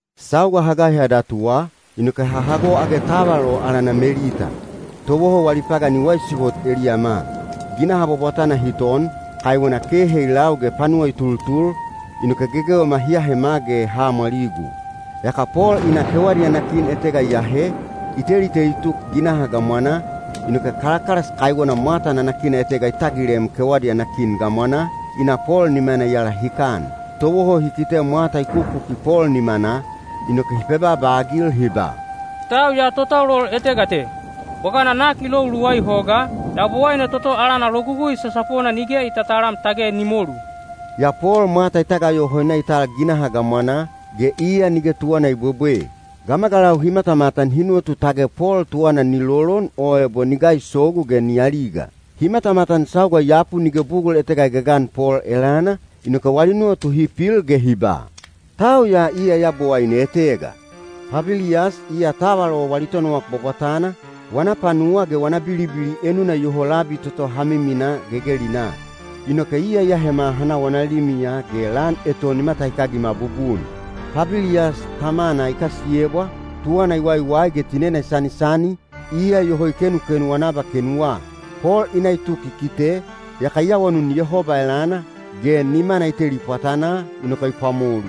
Sauga ha gaiha datuwa, inoke ha hago age taval o alana Melita. Towoho wali pagan i waisi hot eliyama. Ginaha bwabwatana hi ton, kaiwena kehe i lau ge panuwa i tultul, inoke gegewema hi ahema ge ha amwaligu. Yaka Pol i na kewadi ana kin etega i ahe, i teliteli tuk ginaha gamwanaa, inoke kalakalas kaiwena mwata nanakina etega i tagilem kewadi ana kin gamwanaa, i na Pol nimana i alahikan. Towoho hi kite mwata i kukuki Pol nimanaa, inoke hi pebaaba-agil hi ba, “Tau ya totaulol etega te. Bwagana nak i lou luwai hogaa, yabowaine toto alana Logugui Sasapona nige i tatalam tage ni molu.” Yaa Pol mwata i tagayoho i na i tal ginaha gamwanaa, ge iya nige tuwana i bwebwe. Gamagalau hi matamatan hi nuwatu tage Pol tuwana ni lolon o ebo ni gaisogu ge ni aliga. Hi matamatan sauga i yapu nige bugul etega i gagan Pol elana, inoke wali nuwatu hi pil ge hi ba, “Tau ya iya yabowaine etega.” Pabiliyas, iya taval o wali tonowak bwabwatana, wana panuwa ge wana bilibili enuna iyoho labi toto ha miminaa gegelinaa. Inoke iya i ahema ha na wana limiya ge lan eton i matahikagima bubun. Pabiliyas tamana i kasiyebwa, tuwana i waiwai ge tinena i sanisani, iya iyoho i kenukenu wana abakenuwa. Pol i na i tuk i kite, yaka i awanun Yehoba elana, ge nimana i teli pwatanaa, inoke i pwamolu.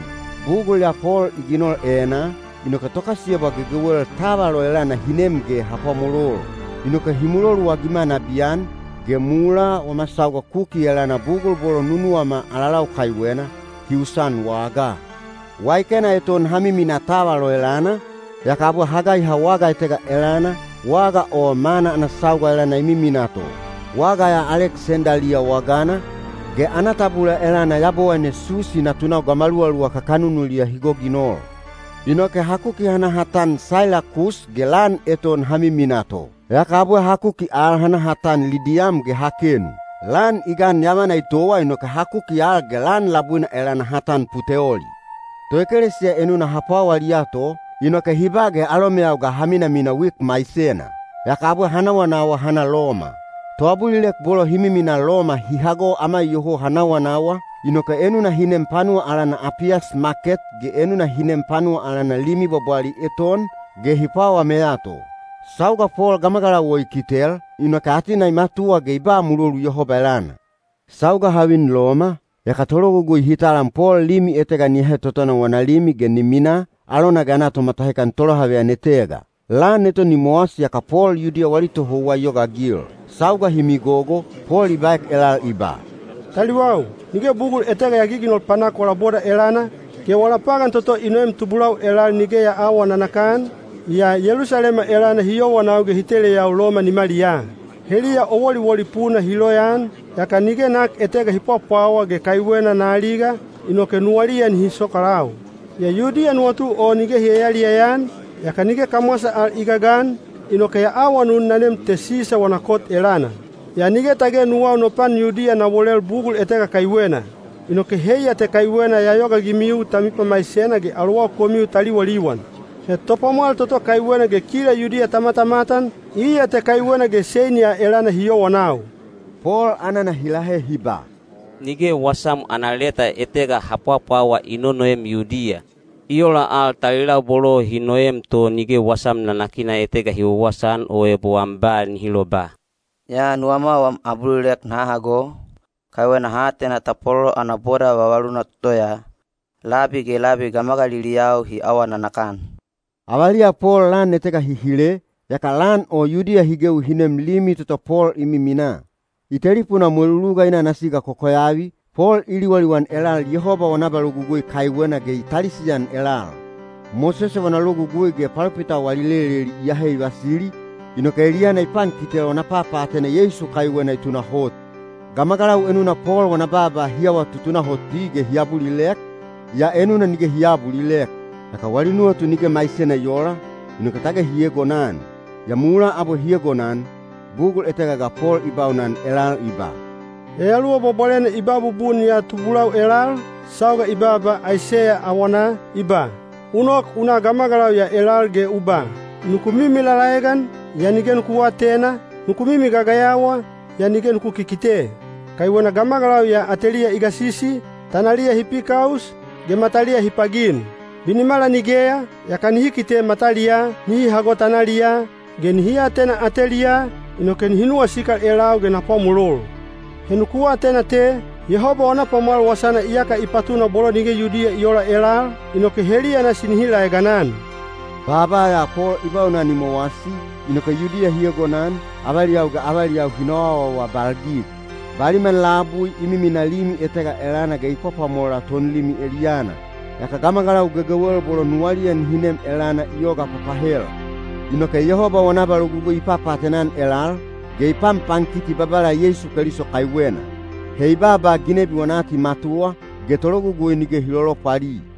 Bugul ya Pol i ginol enaa, inoke tokasiyebwa gegewel taval o elana hi nem ge ha pwamolol. Inoke hi muloluagima nabiyan, ge mulaa wama sauga kuki elana bugul bolo nunuwama alalau kaiwena, hi usan wagaa. Waikena eton ha miminaa taval o elana, yaka abwe ha gaiha waga etega elana, waga o mana ana sauga elana i miminaa to. Waga ya Aleksendaliya wagana, ge ana tabula elana yabowaine Susi natunau gamaluwaluwa kakanunuliya hi goginol. Inoke ha kuki ha na ha tan Sailakus ge lan eton ha miminaa to. Yaka abwe ha kuki al ha na ha tan Lidiyam ge ha kenu. Lan i gan yavana i towa inoke ha kuki al ge lan labuina elana ha tan Puteoli. Toekelesiya enuna ha pwawaliya to, inoke hi ba ge alomeyau ga ha minamina wik maisena. Yaka abwe ha nawanawa ha na Loma. Toabulilek bolo hi miminaa Loma hi hago ama iyoho ha nawanawa, inoke enuna hi nem panuwa alana Apiyas Maket ge enuna hi nem panuwa alana Limi Bwabwali Eton, ge hi pwawameya to. Sauga Pol gamagalau o i kitel, inoke atena i matuwa ge i ba mulolu Yehoba elana. Sauga ha vin Loma, yaka tologugui hi talam Pol limi etega ni ahe totona wana limi ge ni minaa, alona ge ana tomatahikan tolohaveyan etega. Lan eton i mowasi yaka Pol Yudiya wali tohouwa i yogaagil. Sauga hi migogo, Pol i baek elal i ba, “Taliwau, nige bugul etega ya giginol panak wala boda elana, ge wala pagan toto i noem tubulau elal nige ya aawa nanakan, yaa Yelusalema elana hi yowanau ge hi teleyau Loma nimaliyaa. Heliya o woliwoli puna hi loyaan, yaka nige nak etega hi pwapwawa ge kaiwena na aliga, inoke nuwaliya nihi sokalau. Yaa Yudiya nuwatu o nige hi yaliyaya-an, yaka nige kamwasa al i gagan, inoke ya awanun na nem te Sisa wana kot elana. Yaa nige tage nuwau no pan Yudiya na wolel bugul etega kaiwena. Inoke heiya te kaiwena ya yogaagimiu ta mipamaisena ge alowau komiu ta liwaliwan. He topwamwal toto kaiwena ge kila Yudiya ta matamatan, iya te kaiwena ge sein ya elana hi yowanau.” Pol anana hi lahe hi ba, “Nige wasam ana leta etega ha pwapwawa i nonoem Yudiya. I ola al talilau bolo hi noem to nige wasam nanakina etega hi wawasaan o ebo am ba nihi loba. Yaa nuwama wam abulilek naha hago, kaiwena ha atena tapwalolo ana boda vavaluna toto ya, labi ge labi gamagaliliyau hi awa nanakan.” Avaliya Pol lan etega hi hile, yaka lan o Yudiya hi gewi hi nem limi toto Pol i miminaa. I telipunaa mweluluga i na ana siga kokoyavi, Pol i liwaliwan elal Yehoba wana abalogugui kaiwena ge i talisian elal. Mosese wana Logugui ge palopitau wali leleli i ahe i vasili, inoke eliyana i pankitel wana papaatena Yeisu kaiwena i tunahot. Gamagalau enuna Pol wana baaba hi awa tutunahoti ge hi abulilek, yaa enuna nige hi aabulilek. Yaka wali nuwatu nige maisena i oola, inoke tage hi eegonan. Yaa mulaa abwe hi egonan, bugul etega ga Pol i baunan elal i ba, “Yayaluwa Bwabwalena i ba bubun ya tubulau elal, sauga i baaba Aiseya awanaa, i ba: U nok u na gamagalau ya elal ge u ba: ‘Nuku mimi lalaegan, yaa nige nuku aatena, nuku mimi gagayawa, yaa nige nuku kikite.’ Kaiwena gamagalau ya ateliya i gasisi, tanaliya hi pikaus, ge mataliya hi pagin. Binimala nigeya, yaka nihi kite mataliyaa, nihi hago tanaliyaa, ge nihi atena ateliyaa, inoke nihi nuwasikal elau ge na pwamolol. “He nuku atena te, Yehoba wana pwamwal wasana iyaka i patuna bolo nige Yudiya i oola elal, inoke heliya nasi nihi laeganan.” Baaba ya Pol i baunan i mowasi, inoke Yudiya hi egonan, avaliyau ge avaliyau hi noawaawabalgig. Baliman labui i miminaa limi etega elana ge i pwapwamola tonlimi eliyana. Yaka gamagalau gegewel bolo nuwaliya nihi nem elana i yoga papahel. Inoke Yehoba wana abalogugui i papaatena-an elal, ge i panpankiti Babala Yeisu Keliso kaiwena. He i baaba ginebi wana atimatuwa, ge tologugui nige hi lolopwali.